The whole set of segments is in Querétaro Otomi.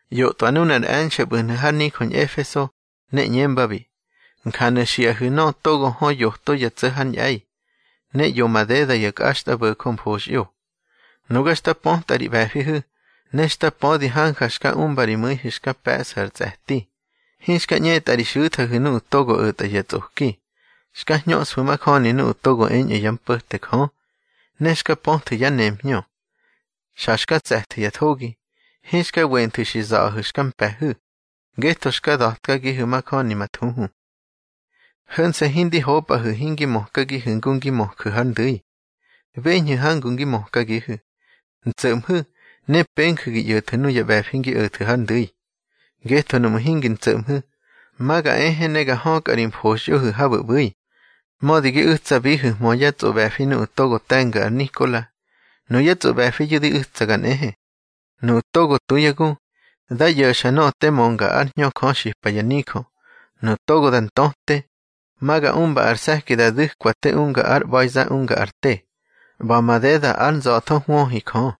ꞌYotꞌwa nunar e̱nxe̱ ꞌbu̱hnu̱ har nijö Ñꞌefeso, ne ꞌñembabi: Njanu̱ xiꞌahu̱ nöꞌö togo hö yoto ya tso̱ hár ñꞌe̱i, ne ꞌyo madeda ya kꞌaxtꞌabo̱jö mfoxꞌyo: Nuga xta pötꞌa ri ꞌbe̱fihu̱, ne xta pödi hanja xka umba ri mu̱ihu̱ xka pe̱ꞌsu̱ ar tsꞌe̱ti. Hinxka ꞌñetꞌa ri xu̱thahu̱ nuꞌu̱ togo o̱tꞌa ya tsꞌoki. Xka hñöꞌsfu̱ majöni nuꞌu̱ togo eñꞌu̱ yá mpo̱te Jö, ne xka pöthu̱ yá nemhñö. Xa xka tse̱thu̱ ya thogi. Hinxka wenthu̱ xi za̱ꞌahu̱ xka mpe̱hu̱, ngetho xka da̱tkagihu̱ majöni ma thuhu. Ho̱nse̱ hindi hopꞌahu̱ hingi mökagihu̱ ngu ngi möju̱ har ndu̱i. Beñhu̱ hangu ngi mökagihu̱. Ntso̱ꞌmhu̱ ne penju̱ gi ꞌyo̱thu̱ nuya ꞌbe̱fi ngi o̱thu̱ har ndu̱i. Ngetho nuꞌmu̱ hingi ntso̱ꞌmhu̱, ma ga ehe ne ga hökꞌa ri mfoxꞌyohu̱ habu̱ ꞌbu̱i. Mödi gi u̱tsabihu̱hmö yá tsꞌoꞌbe̱fi nuꞌu̱ togo te̱nga ar Nikola. Nuyá tsꞌoꞌbe̱fiyu̱ di u̱tsaga nꞌehe. Nuꞌu̱ togo tu yá gu, dá ꞌyo̱xa nöꞌö te mönga ár Hñö Jö xipa ya nijö. Nuꞌu̱ togo da ntöte, ma ga umba ar se̱ki da du̱kwa te unga ar ꞌba̱iza unga ar te, ꞌba̱ madeda ár nza̱tho hwöhi Jö.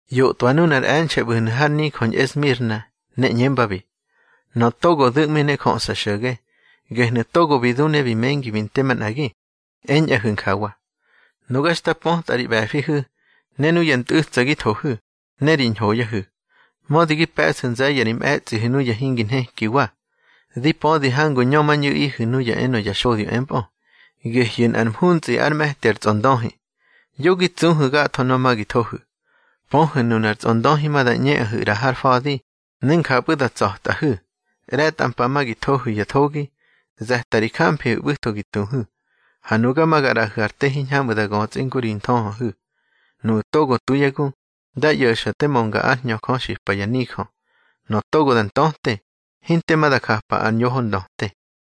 ꞌYotꞌwa nunar e̱nxe̱ ꞌbu̱hnu̱ har nijö Ñꞌesmirna, ne ꞌñembabi: Nöꞌö togo du̱ꞌmi ne jöꞌsa xo̱ge, gehnu̱ togo bi du ne bi mengi bi nte manꞌagi, eñꞌahu̱ njawa: Nuga xta pötꞌa ri ꞌbe̱fihu̱, ne nuya ntꞌu̱tsa gi thohu̱, ne ri ñhoyahu̱. Mödi gi pe̱ꞌsu̱ nze̱ye̱ ri mꞌe̱tsꞌihu̱ nuya hingi nhekiwa. Di pödi hangu ñömañꞌu̱ꞌihu̱ nuya enö ya xodyo empꞌö, gehyu̱ nꞌar mhuntsꞌi ár me̱ti ar tsꞌondöhi. Yo gi tsuhu̱ gatho nöꞌö ma gi thohu̱. Pöhu̱ nunar tsꞌondöhi ma da ꞌñeꞌahu̱ ꞌra har fa̱di, ne njapꞌu̱ da tsꞌa̱tꞌahu̱. ꞌRe̱tꞌa mpa ma gi thohu̱ ya thogi. Ze̱ta ri jamfihu̱ ꞌbu̱tho gi tuhu̱, ha nuga ma ga ꞌraꞌahu̱ ar te hiñhamꞌu̱ da götsꞌi ngu ri nthöhöhu̱. Nuꞌu̱ togo tu yá gu, dá ꞌyo̱xa te mönga ár Hñö Jö xipa ya nijö. Nöꞌö togo da ntöte, hinte ma da japa ar ñoho ndöte.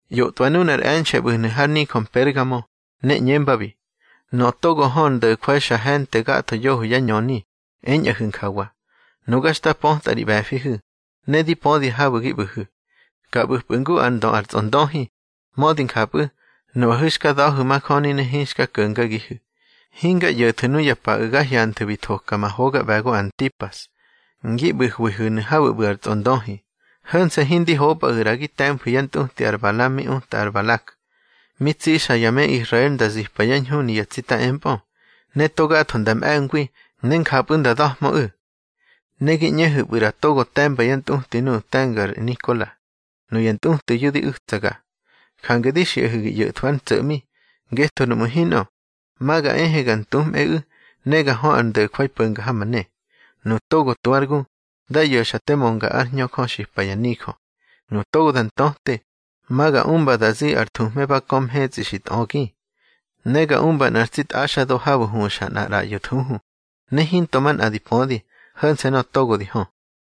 ꞌYotꞌwa nunar e̱nxe̱ ꞌbu̱hnu̱ har nijö Mpergamo, ne ꞌñembabi: Nöꞌö togo hö ar ndo̱jwai xa he̱nte gatho yoho yá ñöni, eñꞌahu̱ njawa: Nuga xta pötꞌa ri ꞌbe̱fihu̱, ne di pödi habu̱ gi ꞌbu̱hu̱, ka ꞌbu̱pꞌu̱ ngu ár ndö ar tsꞌondöhi. Mödi njapꞌu̱, nuꞌahu̱ xka da̱hu̱ majöni ne hinxka ko̱ngagihu̱. Hinga ꞌyo̱thu̱ nuya paꞌu̱ ga hyanthu̱ bi thoka ma hoga ꞌbe̱go ar Antipas, ngi ꞌbu̱hwihu̱nu̱ habu̱ ꞌbu̱ ar tsꞌondöhi. Ho̱nse̱ hindi hopꞌahu̱ ꞌra gi te̱mfu̱ yá ntꞌuti ar Balam mi uta ar Balak. Mi tsixa ya me Israel nda zipa yá ñhuni ya tsita empꞌö, ne togatho nda mꞌe̱ngwi, ne njapꞌu̱ nda da̱hmöꞌu̱. Ne gi ꞌñehu̱pꞌu̱ ꞌra togo te̱mba yá ntꞌuti nuꞌu̱ te̱nga ar Nikola. Nuya ntꞌutiyu̱ di u̱tsaga. Jange di xiꞌahu̱ gi ꞌyo̱thwu̱ ár ntso̱ꞌmi. Ngetho nuꞌmu̱ hinꞌö, ma ga ehe ga ntumꞌeꞌu̱ ga hö ar ndo̱jwai po̱nga ha ma ne. Nuꞌu̱ togo tu ár gu, dá ꞌyo̱xa te mönga ár Hñö Jö xipa ya nijö. Nuꞌu̱ togo da ntöte, ma ga umba da zi ar thuhme ba kö mhetsꞌi xi tꞌögi. Ne ga umba nꞌar tsi tꞌaxdo habu̱ huxa nꞌar ꞌraꞌyo thuhu, ne hinto manꞌa di pödi, ho̱nse̱ nöꞌö togo di hö.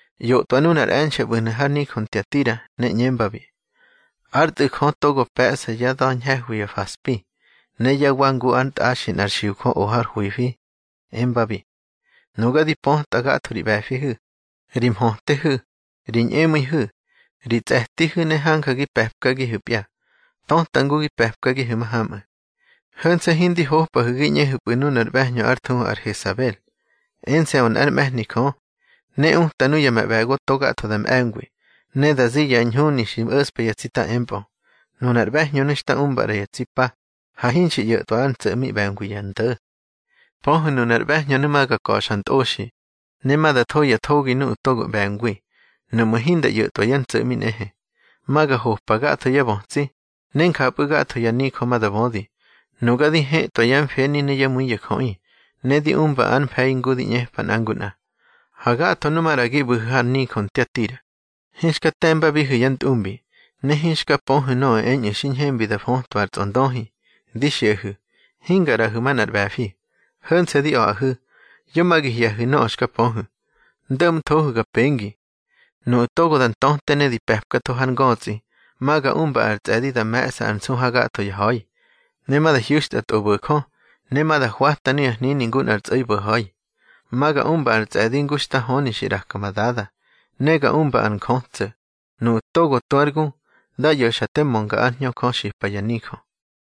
ꞌYotꞌwa nunar e̱nxe̱ ꞌbu̱hnu̱ har nijö Ntiatira, ne ꞌñembabi: Ár Tꞌu̱ Jö togo pe̱ꞌsa yá da̱ ñhe̱hwi ya faspi, ne yá wa ngu ár ntꞌaxi nꞌar xiujö o har hwifi, embabi: Nuga di pötꞌa gatho ri ꞌbe̱fihu̱, ri mhötehu̱, ri ñꞌemu̱ihu̱, ri tsꞌe̱tihu̱, ne hanja gi pe̱pkagihu̱pya, töta ngu ngi pe̱pkagihu̱ mahamꞌu̱. Ho̱nse̱ hindi hopꞌahu̱ gi ꞌñehu̱pꞌu̱ nunar ꞌbe̱hñö ár thuhu ar Hesabel. Ense̱ꞌö nꞌár mꞌe̱hni Jö, ne uta nuya ma ꞌbe̱go togatho da mꞌe̱ngwi, ne da zi ya ñhuni xi mꞌo̱ꞌspa ya tsita empꞌu̱. Nunar ꞌbe̱hñönu̱ xta umba ꞌra ya tsi pa, ha hinxi ꞌyo̱tꞌwa ár ntso̱ꞌmi ꞌbe̱ngwi ya ndo̱. Pöhu̱ nunar ꞌbe̱hñönu̱ ma ga ka̱xa ntꞌoxi, ne ma da tho ya thogi nuꞌu̱ togo ꞌbe̱ngwi, nuꞌmu̱ hinda ꞌyo̱tꞌwa yá ntso̱ꞌmi nꞌehe. Ma ga hopa gatho yá bötsi, ne njapꞌu̱ gatho ya nijö ma da bödi, nuga di hëtwa yá mfeni ne yá mu̱i ya jöꞌi, ne di umba ár mfe̱i ngu di ꞌñepa nꞌa ngu nꞌa. Ha gatho nu maꞌra gi ꞌbu̱hu̱ har nijö Ntiatira, hinxka te̱mbabihu̱ yá ntꞌumbi, ne hinxka pöhu̱ nöꞌö eñꞌu̱ xi ñhembi da fötwa ar tsꞌondöhi, di xiꞌahu̱, hinga ꞌraꞌahu̱ manꞌar ꞌbe̱fi. Ho̱nse̱ di a̱ꞌahu̱, yo ma gi hye̱hu̱ nöꞌö xka pöhu̱. Ndo̱ꞌmthohu̱ ga pengi. Nuꞌu̱ togo da ntöte ne di pe̱pkatho har ngötsꞌi, ma ga umba ar tsꞌe̱di da me̱ꞌsa ár nsu hagatho ya ha̱i. Ne ma da hyu̱xtya tꞌobo̱jö, ne ma da hwata nuya hnini ngu nꞌar tsꞌo̱i bo̱ha̱i. Ma ga umba ar tsꞌe̱di ngu xta höni xi ꞌraka ma Dada. Ne ga umba ar njötso̱. Nuꞌu̱ togo tu ár gu, dá ꞌyo̱xa te mönga ár Hñö Jö xipa ya nijö.